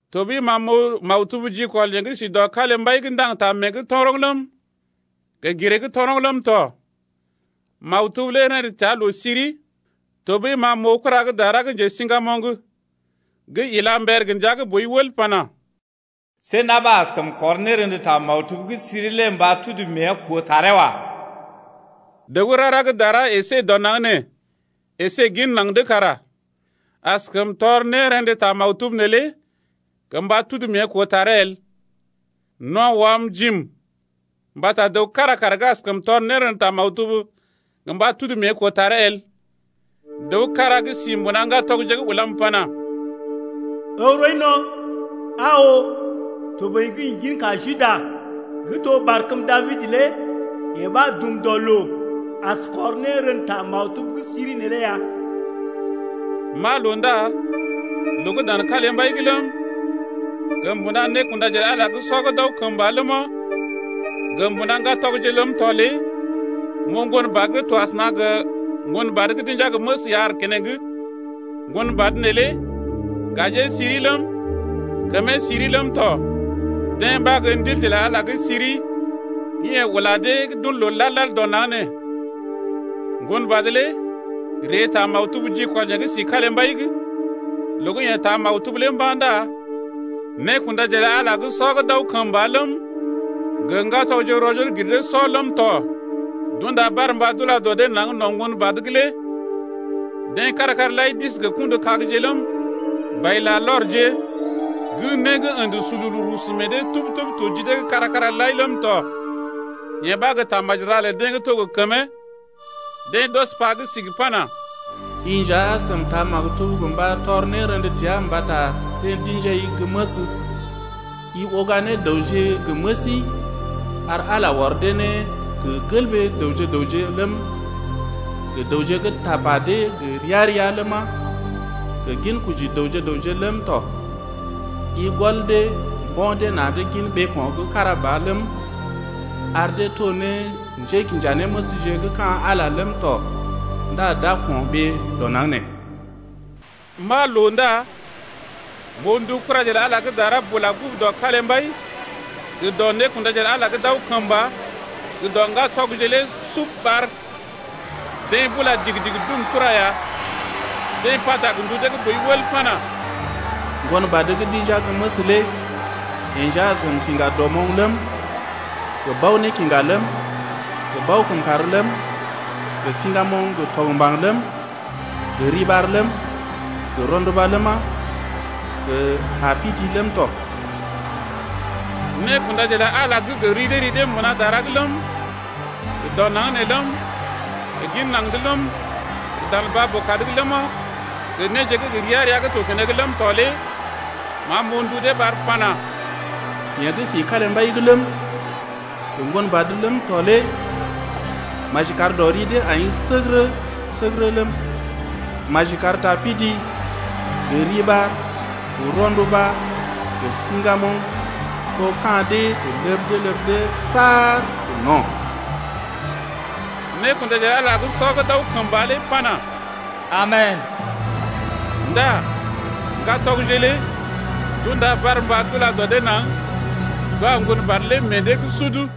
Tɔɓəi ma m’oo maktub jikɔl yeḛ gə́ si dɔ kalimbai’g gə́ ndaŋg ta mée’g toroŋ ləm, gə giree’g toroŋ ləm tɔ. Maktub lé rḛdə təa loo-siri. Tɔɓəi ma m’oo kura gə́ dara gə́ njesiŋgamoŋ gə́ ila mber gə ndia gə́ boi wəl pana: See na̰ ɓa askəm kɔr nérḛdə ta maktub gə́ siri lé gə mba tudu mée koo taree wa. Dəw gə́ rara gə́ dara əsé dɔ naŋg nee əsé gin naŋg’d kara askəm tɔr nérḛdə ta maktub neelé gə mba tudu mée koo taree el. No̰ wam jiim mbata dəw kára kara askəm tɔr nérḛdə ta maktub gə mba tudu mée koo taree el. Dəw kára gə́ si mbuna ŋgatɔgje’g ulam pana: Ǝw rɔi no̰. Aa oo, toboḭ gə́ ḭ ginka Juda, gə́ to barkəm Dabid lé yeḛ ɓa dum dɔ loo as kɔr nérḛdə ta maktub gə́ siri neelé ya. M’aa loo ndá loo gə́ dan kalimbai’g ləm, gə mbuna nékundaje lə Ala sɔ gə́ d’aw kəmba ləma, gə mbuna ŋgatɔgje’g ləm tɔ lé m’oo Ŋgonbad gə́ to asəna gə ŋgonbad gə́ d’inja gə́ məs ya aar keneŋ. Ŋgonbad neelé lé gajee siri ləm, kəmee siri ləm tɔ. Deḛ ɓa gə́ ndilje lə Ala gə́ siri gə́ yeḛ ula deḛ gə́ d’un loo lad-lad dɔ naŋg nee. Ŋgonbad lé ree taa maktub jikɔl yeḛ gə́ si kalimbai’g. Loo gə́ yeḛ taa maktub lé mba̰ ndá nékundaje lə Ala sɔ gə́ d’aw kəmba ləm, gə ŋgatɔgje rɔ-joo-gir-dee-sɔ ləm tɔ d’unda barmba d’ula dɔ dee naŋg no̰ Ŋgonbad’g lé. Deḛ kára-kára lai d’isi gə kṵdu-kagje ləm, bai-larlɔrje gə́ né ə̰də sululu rusu mee dee tub-tub to ji dee’g kára-kára lai ləm tɔ. Yee ɓa gə́ tamaji ra lə deḛ gə́ to gə kəmee. Deḛ d’ɔs pa gə́ sigi pana: I nja askəm taa maktub gə mba tɔr nérḛdə təa mbata deḛ d’ḭjai gə́ məs, i uga ne dəwje gə məsi ar Ala ɔr dee ne gə gelɓee dəwje-dəwje ləm, gə dəwje gə́ tapa dee gə ria-ria ləma, gə ginkoji dəwje gə raŋg ləm tɔ. I gɔl dee mbo̰ dee na̰’d gin ɓeeko̰ gə́ kára ba ləm, ar dee to ne njékinjanéməsje gə́ ka̰ Ala ləm tɔ ndá d’a ko̰ɓee dɔ naŋg ne. M’aa loo ndá m’oo ndu kuraje lə Ala gə́ dara bula gə́ gugu dɔ kalimbai gə dɔ nékundaje lə Ala gə́ d’aw kəmba gə dɔ ŋgatɔgje lé sub lé ɓar. Deḛ bula digi-digi dum tura ya. Deḛ pata gə ndu dee gə́ boi wəl pana: Ŋgonbad gə́ d’inja gə́ məs lé yeḛ nja askəm kiŋga dɔmoŋ ləm, gə bao-nékiŋga ləm, gə bao-kəmkàr ləm, gə siŋgamoŋ gə tɔgmbaŋ ləm, gə riɓar ləm, gə rɔnduba ləma, gə tapidi ləm tɔ. Nékundaje lə Ala gə́ gə ri dee ri dee mbuna dara’g ləm, gə dɔ naŋg nee ləm, gə gin naŋg’d ləm, gə dan baa-boo-kad’g ləma, gə néje gə́ gə ria-ria gə́ to keneŋ ləm tɔ lé ma m’oo ndu dee ɓar pana: Yeḛ gə́ si kalimbai’g ləm, Gə Ŋgonbad ləm tɔ lé Maji kar dɔ ri dee ai səgərə-səgərə ləm, Maji kar ta pidi gə riɓar gə rɔnduba gə siŋgamoŋ To ka̰ dee gə ləb dee ləb dee saar gə no̰. Nékundaje lə Ala gə́ sɔ gə́ d’aw kəmba lé pana: Amen! Ndá ŋgatɔgje lé d’unda barmba d’ula dɔ dee naŋg d’wa ŋgon badə lé meḛ dee’g sudu.